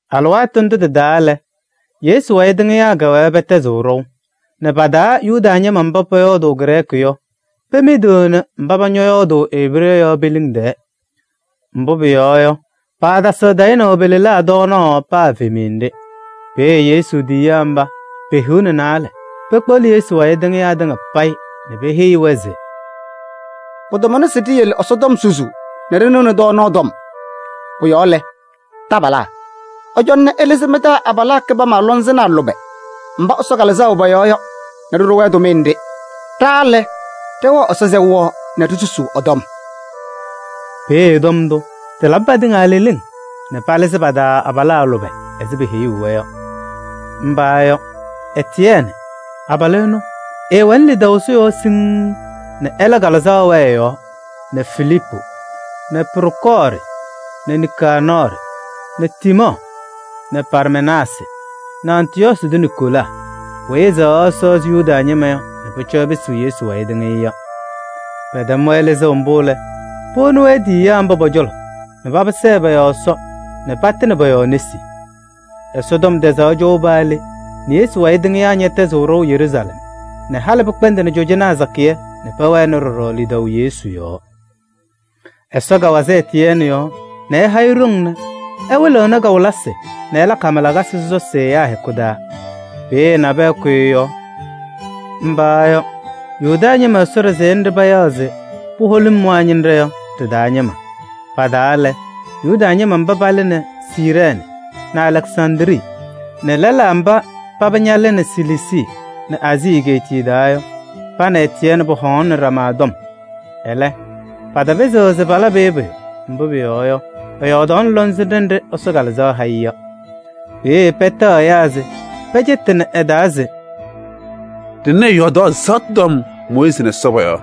Alɩwaatʋ ndʋ tɩ-taa lɛ, Yesu wayɩ tɩŋɩyaa kɛwɛɛ pɛtɛzɩɣ ɖɔʋ nɛ pa-taa Yuda ñɩma mba pɔyɔɔdʋʋ Grɛɛkɩ yɔ, pemidiɣni mba paba ñɔyɔɔdʋʋ Ebree yɔ pe-liŋ tɛɛ. Mbʋ pʋyɔɔ yɔ, paatasɩɣ tayɩnaʋ pe-lelaa tɔɔnaɣ paa evemiye nɖɩ. Peeye Yesu tiyiyaa mba pe-hiu nɛ naalɛ pekpeɣli Yesu wayɩ tɩŋɩyaa tɩŋa payɩ nɛ peheyi-wɛ se: “Pɩtamʋnɩ se ɖiyele Ɛsɔtɔm susuu nɛ ɖɩnɩɣnɩ tɔɔnaɣ tɔm. Pʋ-yɔɔ lɛ, taabalaa! Ɩcɔna nɛ ɩlɩzɩ mɩ-taa abalaa kɩbama lɔŋsɩnɖaa lʋbɛ mba Ɛsɔ Kalɩzaɣ wɛ pɔ-yɔɔ yɔ nɛ ɖɩɖʋ-wɛ tʋmɩyɛ nɖɩ. Ɖa ɖɛwɛɣ Ɛsɔ sɛʋ yɔɔ nɛ ɖisusuu ɛ-tɔm.” Peeye tɔm ndʋ tɩlabɩ patɩŋa leleŋ nɛ palɩzɩ pa-taa abalaa lʋbɛ ɛzɩ peheyuu-wɛ yɔ. Mba yɔ: Etiyɛɛnɩ, abalʋ ɛnʋ, ɛwɛnɩ lidaʋ Ɛsɔ yɔɔ siŋŋ nɛ ɛlɛ Kalɩzaɣ wɛɛ ɛ-yɔɔ nɛ Filiipu nɛ Prokɔɔrɩ nɛ Nikaanɔɔrɩ nɛ Tiimɔɔ nɛ Parmenaasɩ nɛ Antɩyɔɔsɩ tʋ Niikolaa weyi ɛsɛɣaɣ Ɛsɔ ɛzɩ Yuda ñɩma nɛ pʋcɔ ɛpɩsɩ Yesu wayɩ tɩŋɩyʋ yɔ. Pɛtɛm-wɛ lɩzʋʋ mbʋ lɛ, powoni-wɛ tiyiyaa mba pɔ-cɔlɔ nɛ paba sɛɛ pɔ-yɔɔ Ɛsɔ nɛ patɩnɩ pɔ-yɔɔ nesi. Ɛsɔtɔm tɛzaɣ cɔʋ paa le nɛ Yesu wayɩ tɩŋɩyaa ñɛtɛzɩɣ ɖɔʋ Yeruusalɛm nɛ halɩ pɩkpɛndɩnɩ cɔjɔnaa sakɩyɛ nɛ pɛwɛnɩ ɖɔɖɔ lidaʋ Yesu yɔɔ. Ɛsɔ kawazɩ Etiyɛɛnɩ yɔɔ nɛ ɛha-ɩ ɖoŋ nɛ ɛwɩlɩɣnɩ kawɩlɩsɩ nɛ ɛlakɩ hama lakasɩ sɔsɔsɩ ɛyaa hɛkʋ taa. Peeye nabɛyɛ kʋyɩ ɛ-yɔɔ. Mba yɔ: Yuda ñɩma Ɛsɔ ɖɩsɛyɛ nɖɩ payaɣ se Puholimwaa ñɩnɖɛ yɔ ɖɩ-taa ñɩma. Pa-taa lɛ: Yuda ñɩma mba palɩnɩ Siirɛɛnɩ nɛ Alɛksandrii nɛ lɛlaa mba paba ñalɩnɩ Siliisii nɛ Aazii egeetiye taa yɔ. Pa nɛ Etiyɛɛnɩ pɔhɔŋaɣnɩnɩ ɖama tɔm. Ɛlɛ, patapɩzɩɣ se palabɩ-ɩ pʋyʋ, mbʋ pʋyɔɔ yɔ, ɛyɔɔdaɣnɩ lɔŋsɩnɖɛ nɖɩ Ɛsɔ Kalɩzaɣ ha-ɩ yɔ. Peeye pɛtɛɣ ɛyaa se pɛcɛtɩnɩ ɛ-taa se: “Ɖɩnɩ ɛyɔɔdaɣ ɛzaɣtʋ tɔm Mooyiizi nɛ Ɛsɔ pɔ-yɔɔ!”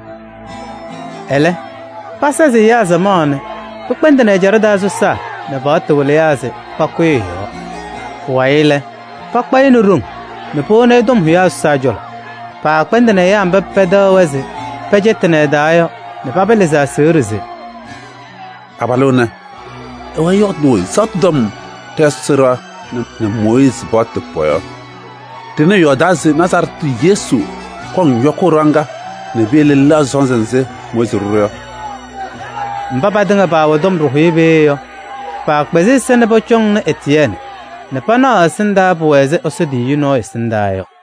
Ɛlɛ pasazɩ ɛyaa samaɣ nɛ pɩkpɛndɩnɩ ɛjaɖɛ taa sɔsaa nɛ paɣtʋ wɩlɩyaa se pakʋyɩ ɛ-yɔɔ. Pʋwayɩ lɛ, pakpa-ɩ nɛ ɖoŋ nɛ powoni tɔm hʋyaa sɔsaa cɔlɔ. Paakpɛndɩnɩ ɛyaa mba pɛtɛɣ-wɛ se pɛcɛtɩnɩ ɛ-taa yɔ nɛ paba lɩzɩ aseɣɖe se: “Abalʋ ɛnɛ, ɛwɛɛ ɛyɔɔdʋʋ ɛzaɣtʋ tɔm ɖɛ-Ɛsɔ ɖɩɣa nɛ Mooyiizi paɣtʋ pɔ-yɔɔ! Ɖɩnɩ ɛyɔɔdaa se Nazarɛɛtɩ tʋ Yesu kɔŋ yɔkʋʋ ɖɩɣa ŋga nɛ piyele ɛlɛɣzɩ sɔnzɩ nzɩ Mooyiizi ɖʋ-ɖʋ yɔ.” Mba patɩŋa paawɛ tɔm ɖɩhʋyɛ peeye yɔ, paakpɛzɩ ɛza nɛ pɔcɔŋnɩ Etiyɛɛnɩ, nɛ pana ɛ-ɛsɩndaa, pʋwɛ ɛzɩ Ɛsɔ tiyiyu nɔɔyʋ ɛsɩndaa yɔ.